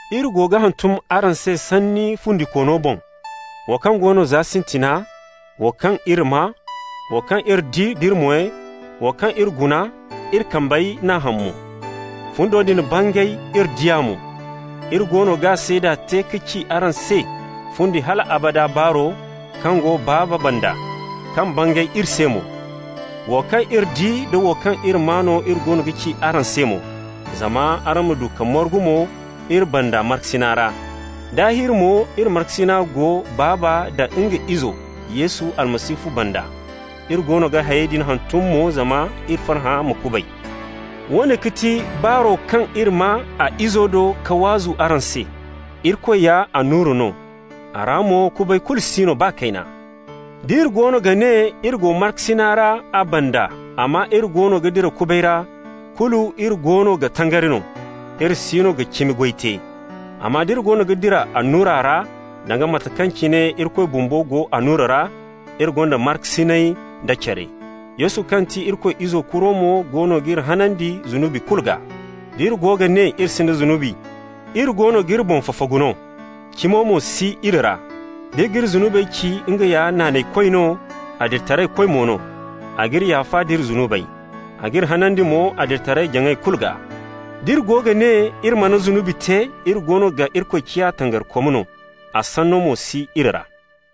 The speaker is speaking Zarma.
Iri go ga hantum araŋ se Sanni fundikoono boŋ, wo kaŋ go no za sintina, wo kaŋ iri maa, wo kaŋ iri di d'iri moy, wo kaŋ iri guna, iri kambey n'a ham mo. Fundo din bangay, iri di a mo. Iri goono g'a seeda te ka ci araŋ se fundi hal abada baaro, kaŋ go Baaba banda, kaŋ bangay iri se mo. Wo kaŋ iri di da wo kaŋ iri maa no iri goono ga ci araŋ se mo, zama araŋ ma du ka margu mo iri banda markasina ra. Daahir mo iri markasina go Baaba nda nga Izo Yesu Almasihu banda. Iri goono ga hayey din hantum mo zama iri farhã ma kubay. Woone ga ti baaro kaŋ iri maa a Izo do ka waazu araŋ se: Irikoy ya annura no. A ra mo kubay kulu si no baa kayna. D'iri goono ga ne iri go markasina ra a banda, amma iri goono ga dira kubay ra, kulu iri goono ga tangari no. Iri siino ga cimi goy te. Amma d'iri goono ga dira annura ra, danga mate kaŋ cine Irikoy bumbo go annura ra, iri gonda markasinay da care. Yesu kaŋ ti Irikoy Izo kuro mo goono g'iri hanandi zunubi kulu gaa. D'iri go ga ne iri sinda zunubi, iri goono g'iri boŋ fafagu no. Cimo mo si iri ra. D'iri g'iri zunubey ci, nga ya naanaykoy no, adilitaraykoy mo no, a g'iri yaafa nd'iri zunubey. A g'iri hanandi mo adilitaray-jaŋay kulu gaa. D'iri go ga ne iri mana zunubi te, iri goono ga Irikoy ciya tangarikom no, a sanno mo si iri ra.